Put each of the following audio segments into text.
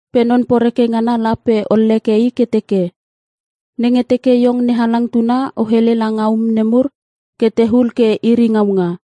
Pe non poreke ngana la pe olleke i ke teke, “Nenge teke iong NeHalang tuna o hele langa um nemur ke tehul ke iri ngaunga.”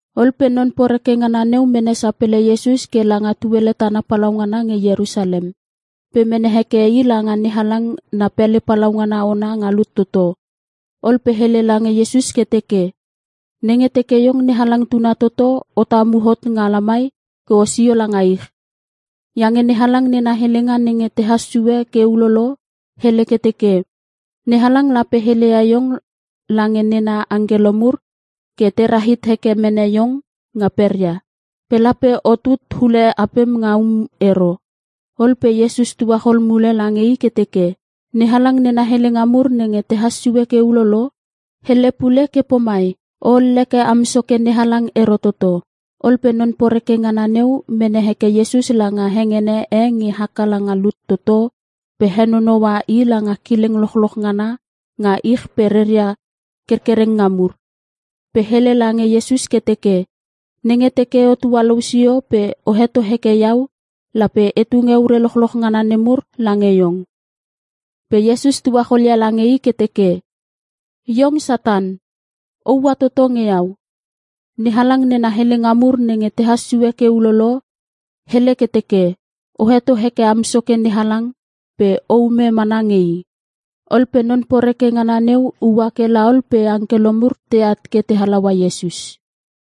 Ol pe non poreke ngana neu mene sapele Iesus ke langa tuele tana palaungana nge Ierusalem. Pe mene heke i langa NeHalang na pele palaungana ona nga lut toto. Ol pe hele lange Iesus ke teke, “Nenge teke Iong NeHalang tuna toto o tamu hot nga lamai ke osio langa ich. Iange NeHalang nena helenga nenge tehas sue ke ulolo, hele ke teke, “‘NeHalang lape heleia iong lange nena angkelo mur ke te rahit heke mene iong nga peria. Pe lape otut hule apem nga um ero.’” Ol pe Iesus tuachol mule lange i ke teke, “NeHalang nena helenga mur nenge tehas sue ke ulolo, hele pule ke pomai, ‘O olleke am Soke NeHalang ero toto.’” Ol pe non poreke ngana neu mene heke Iesus langa hengene e nge haka langa lut toto pe henonoua I langa kileng lochloch ngana nga ich pe reia kerkerenga mur. Pe hele lange Iesus ke teke, “Nenge teke o tualou sio pe o heto heke iau lape e tunge ure lochloch ngana nemur lange iong.” Pe Iesus tuacholia lange i ke teke, “Iong Satan! O ua toto nge iau. NeHalang nena helenga mur nenge tehas sue ke ulolo, hele ke teke, ‘O heto heke am Soke NeHalang pe o ume mana nge i.’” Ol pe non poreke ngana neu ua ke la ol pe angkelo mur teat ke te halaua Iesus.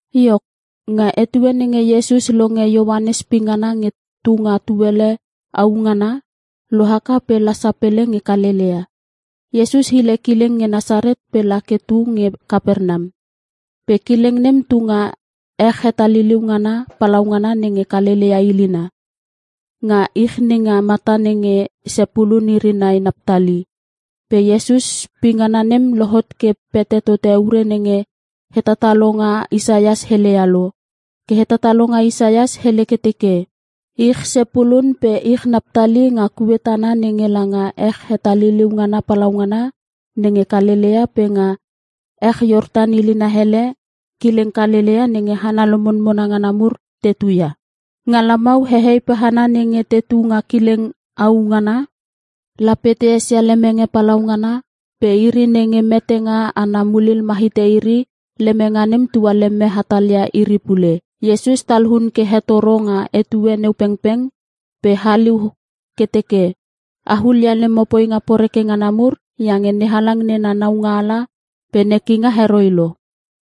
Iok, nga etue nenge Iesus longe Ioanes pingana nge tu nga tuele au ngana, lohaka pe la sapele nge Kalelea. Iesus hile kileng nge Nasaret pe la ke tu nge Kapernam. Pe kileng nem tunga ech hetaliliu ngana palaungana nenge Kalelea ilina. Nga ich nenga mata nenge Sepulun iri nai Naptali. Pe Iesus poingana nem lohot ke pete tote ure nenge hetatalonga Isaias heleia lo. Ke hetatalonga Isaias hele ke teke, “Ich Sepulun pe Ich Naptali nga kue tana nenge langa ech hetaliuliu ngana palaungana nenge Kalelea pe nga ech Iortan ilina hele kileng Kalelea nenge hana lomonmona ngana mur te tuia. Nga lamau hehei pe hana nenge tetu nga kileng au ngana lape te esia lemenge palaungana. Pe iri nenge metenga ana mulil ma hite iri lemenge nem tualeme hatalia iri pule.” Iesus talun ke hetoro nga etue neu pengpeng pe haliu ke teke, “A hulia lemo poinga poreke ngana mur iange NeHalang nena naualanga pe nekinga heroi lo.”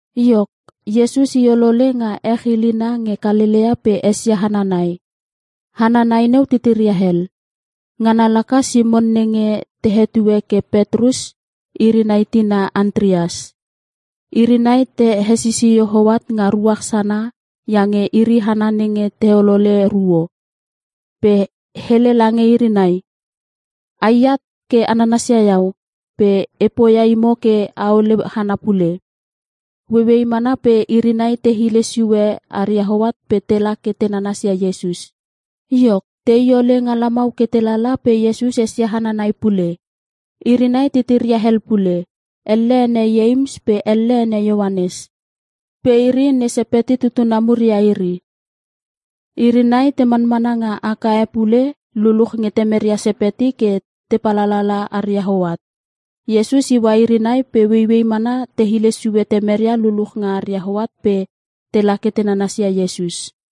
Iok, Iesus i olole nga ech ilina nge Kalelea pe esia hana nai. Hana nai neu titiria hel. Ngana laka Simon nenge te hetue ke Petrus iri nai tina Antreas. Iri nai te hesisio hoat nga ruach sana iange iri hana nenge te holole ruo. Pe hele lange iri nai, “A i at ke a nanasia iau pe e poia imo ke aole hana pule!” Ueiuei mana iri nai te hile sue aria hoat pe tela ke te nanasia Iesus. Iok, tei ole nga lamau ke telala pe Iesus esia hana nai pule. Iri nai titiria hel pule. Elle ene Ieims pe elle ene Ioanes. Pe iri ne Sepeti tutuna mur ia iri. Iri nai te manmana nga aka e pule luluch nge temeria Sepeti ke te palalala aria hoat. Iesus iua iri nai pe ueiuei mana te hile sue temeria luluch nga aria hoat pe tela ke te nanasia Iesus.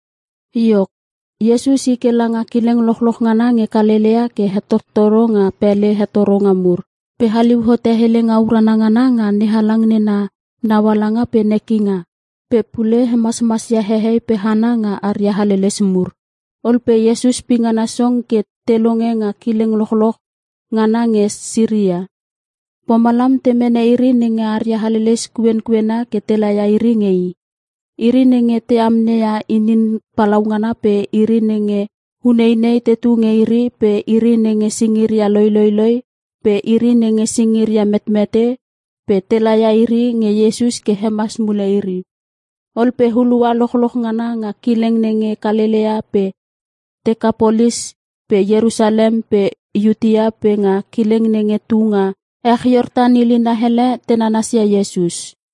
Iok, Iesus i ke langa kileng lochloch ngana nge Kalelea ke hetottoro nga pele hetoronga mur. Pe haliu hote helenga urana ngana nga NeHalang nena naualanga pe nekinga. Pe pule hemasmasia hehei pe hana nga aria haleles mur. Ol pe Iesus pingana song ke te longe nga kileng lochloch ngana nge Siria. Pomalam te mene iri nenge aria haleles kuenkuena ke te laia iri nge I. Iri nenge te amneia inin palaungana pe iri nenge uneinei tetu nge iri pe iri nenge singiria loiloiloi pe iri nenge singiria metmete pe te laia iri nge Iesus ke hemas mule iri. Ol pe hulua lochloch ngana nga kileng nenge Kalelea pe Tekapolis pe Ierusalem pe Iutea pe nga kileng nenge tu nga ech Iortan ilina hele te nanasia Iesus.